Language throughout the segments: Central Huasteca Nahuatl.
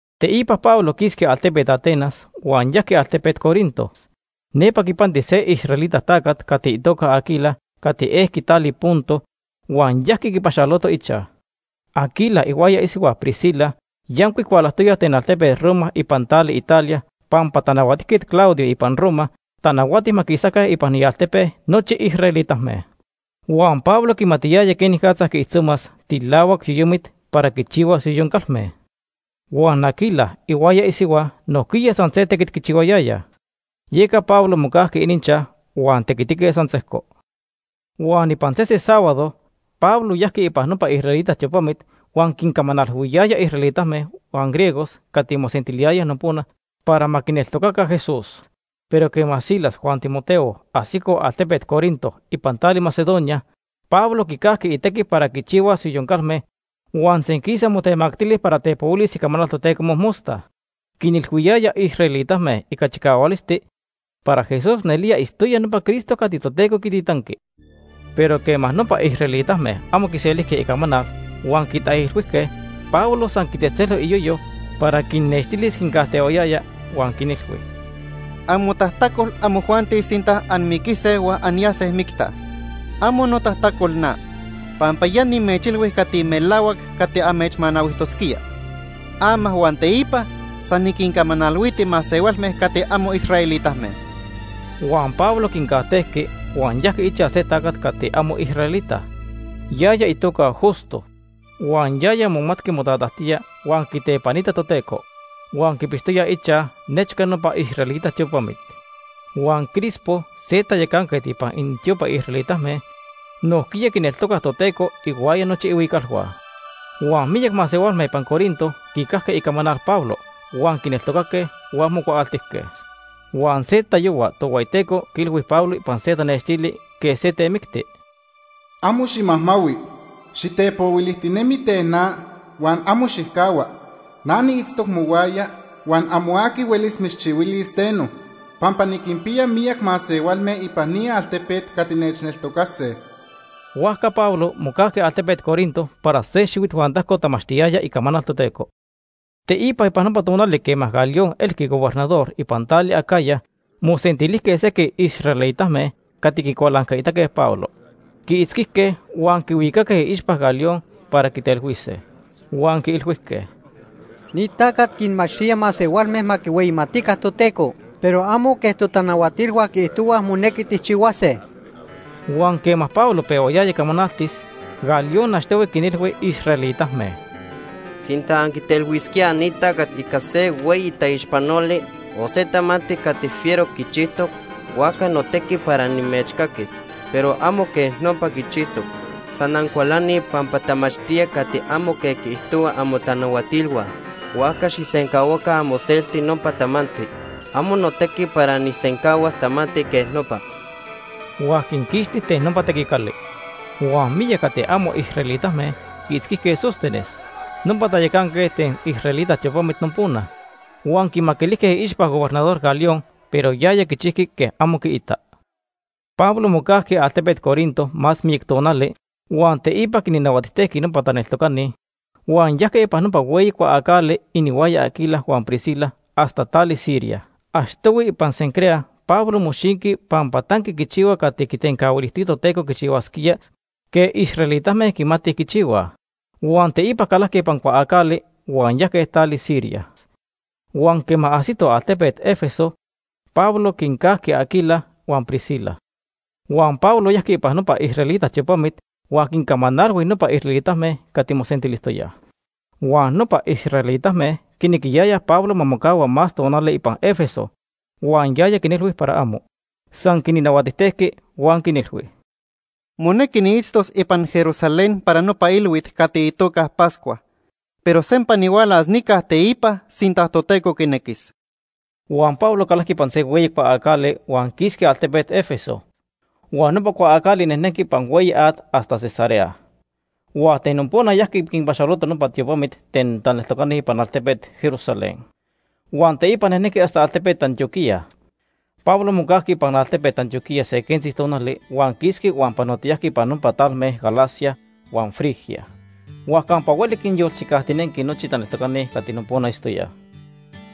Teipa Pablo quisqui altepet Atenas huan yajqui altepet Corinto. Nepa quipanti se israelita tacat cati itoca Aquila cati ejqui tali Ponto huan yajqui quipaxaloto ichaj. Aquila ihuaya isihua Priscila yancuic hualajtoyaj ten altepet Roma ipan tali Italia pampa Tanahuatijquet Claudio ipan Roma tanahuati ma quisaca ipan ialtepe nochi israelitame. Huan Pablo quimatiyaya quenicatza quiijtzomas tilahuac yoyomit para quichihuas yoyon calme. Huan Aquila ihuaya isihua nojquiya san se tequit quichihuayayaj. Yeca Pablo mocajqui ininchaj huan tequitique san sejco. Huan ipan sese sábado Pablo yajqui ipan nopa israelita tiopamit huan quincamanalhuiyaya israelitame huan griegos cati mosentiliyayaj nopona para ma quineltocaca Jesús. Pero quema Silas huan Timoteo ajsicoj altepet Corinto ipan tali Macedonia, Pablo quicajqui itequi para quichihuas yoyon calme huan senquisa motemactili para tepohuilis icamanal Toteco mojmosta. Quinilhuiyaya israelitame ica chicahualisti para Jesús nelía itztoya nopa Cristo cati Toteco quititanqui. Pero quema nopa israelitame amo quiselijque icamanal huan quitaijilhuijque, Pablo san quitzejtzelo iyoyo para quinnextilis quincajtehuayaya, huan quinilhui: ―Amotajtacol amojuanti sinta anmiquise huan anyase micta. Amo notajtacol na, pampa ya nimechilhui cati melahuac cati amechmanahuijtosquía. Ama huan teipa san niquincamanalhuiti masehualme cati amo israelitame. Huan Pablo quincajtejqui huan yajqui ichaj se tacat cati amo israelita. Yaya itoca Justo huan yaya momatqui motatajtía huan quitepanita Toteco, huan quipixtoya ichaj nechca nopa israelita tiopamit. Huan Crispo, se tayacanquet ipan inintiopa israelitame, nojquiya quineltocac Toteco ihuaya nochi ihuicalhua. Huan miyac masehualme ipan Corinto quicajque icamanal Pablo huan quineltocaque huan mocuaaltijque. Huan se tayohua Tohueyiteco quiilhui Pablo ipan se tanextili quej se temicti: “Amo ximajmahui. Xitepohuilijtinemi ten na huan amo xijcahua. Na niitztoc mohuaya, huan amo aqui huelis mitzchihuilis teno, pampa niquinpiya miyac masehualme ipan ni altepet cati nechneltocase.” Huajca Pablo mocajqui altepet Corinto para se xihuit huan tajco tamachtiyaya icamanal Toteco. Teipa ipan nopa tonali quema Galión elqui gobernador ipan tali Acaya, mosentilijque sequij israelitame cati quicualancaitaque Pablo. Quiitzquijque huan quihuicaque iixpa Galión para quitelhuise. Huan quiilhuijque: ―Ni tacat quinmachtía masehualme ma quihueyimatica Toteco, pero amo quej totanahuatilhua quiijtohuaj monequi tijchihuase. Huan quema Pablo pehuayaya camanaltis, Galión achtohui quinilhui israelitame: ―Sinta anquitelhuisquíaj ni tacat ica se hueyi taixpanoli o se tamanti cati fiero quichijtoc, huajca notequi para nimechcaquis. Pero amo quej nopa quichijtoc. San ancualanij pampa tamachtía cati amo quej quiijtohuaj amotanahuatilhua, huajca xijsencahuaca amoselti nopa tamanti. Amo notequi para nijsencahuas tamanti quej nopa. Huan quinquixti ten nopa tequicali. Huan miyac cati amo israelitame quiitzquijque Sóstenes, nopa tayacanquet ten israelita tiopamit nopona. Huan quimaquilijque iixpa Gobernador Galión, pero yaya quichijqui quej amo quiitac. Pablo mocajqui altepet Corinto más miyac tonali huan teipa quinnahuatijtejqui nopa taneltocani, huan yajque ipan nopa hueyi cuaacali inihuaya Aquila huan Priscila hasta tali Siria. (Achtohui ipan Cencrea Pablo moxinqui pampa tanqui quichihua cati quitencahuilijtoya Toteco quichihuasquía quej israelitame quimatij quichihuaj.) Huan teipa calajque ipan cuaacali huan yajque tali Siria. Huan quema ajsitoj altepet Éfeso, Pablo quincajqui Aquila huan Priscila. Huan Pablo yajqui ipan nopa israelita tiopamit huan quincamanalhui nopa israelitame cati mosentilijtoyaj. Huan nopa israelitame quinequiyayaj Pablo ma mocahua más tonali ipan Éfeso huan yaya quinilhui para amo. San quinnahuatijtejqui huan quinilhui: “Monequi niitztos ipan Jerusalén para nopa ilhuit cati itoca Pascua, pero sempa nihualas nica teipa sinta Toteco quinequis.” Huan Pablo calajqui ipan se hueyi cuaacali huan quisqui altepet Éfeso. Huan nopa cuaacali nejnenqui ipan hueyi at hasta Cesarea. Huan ten nopona yajqui quinpaxaloto nopa tiopamit ten taneltocani ipan altepet Jerusalén. Huan teipa nejnenqui hasta altepet Antioquía. Pablo mocajqui ipan altepet Antioquía se quentzi tonali huan quisqui huan panotiyajqui ipan nopa talme Galacia huan Frigia. Huan campa hueli quinyolchicajtinenqui nochi taneltocani cati nopona itztoyaj.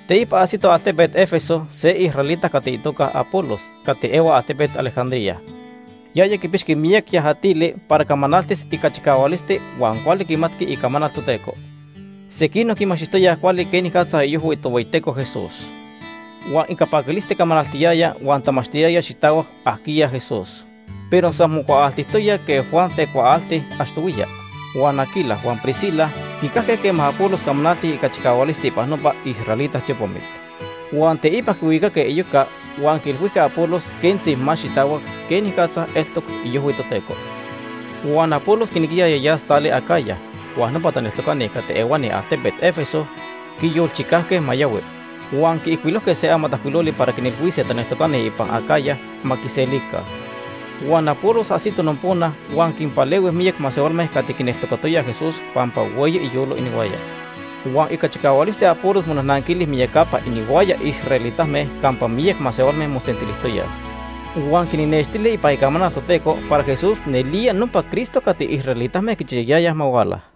Teipa ajsito altepet Éfeso se israelita cati itoca Apolos cati ehua altepet Alejandría. Yaya quipixqui miyac yajatili para camanaltis ica chicahualisti huan cuali quimatqui Icamanal Toteco. Sequinoc quimachtijtoyaj cuali quenicatza iojhui Tohueyiteco Jesús. Huan ica paquilisti camanaltiyaya huan tamachtiyaya xitahuac ajquiya Jesús, pero san mocuaaltijtoya quej Juan tecuaalti achtohuiya. Huan Aquila huan Priscila quicajque quema Apolos camanaltic ica chicahualisti ipan nopa israelita tiopamit. Huan teipa quihuicaque iyoca huan quiilhuijque Apolos quentzi más xitahuac quenicatza eltoc iojhui Toteco. Huan Apolos quinequiyaya yas tali Acaya, huan nopa taneltocani cati ehuani altepet Éfeso quiyolchicajque ma yahui. Huan quiijcuilojque se amatajcuiloli para quinilhuise taneltocani ipan Acaya ma quiselica. Huan Apolos ajsito nopona huan quinpalehui miyac masehualme cati quineltocatoyaj Jesús pampa hueyi iyolo inihuaya. Huan ica chicahualisti Apolos monajnanquili miyacapa inihuaya israelitame campa miyac masehualme mosentilijtoyaj. Huan quinnextili ipan Icamanal Toteco para Jesús nelía nopa Cristo cati israelitame quichiyayayaj ma huala.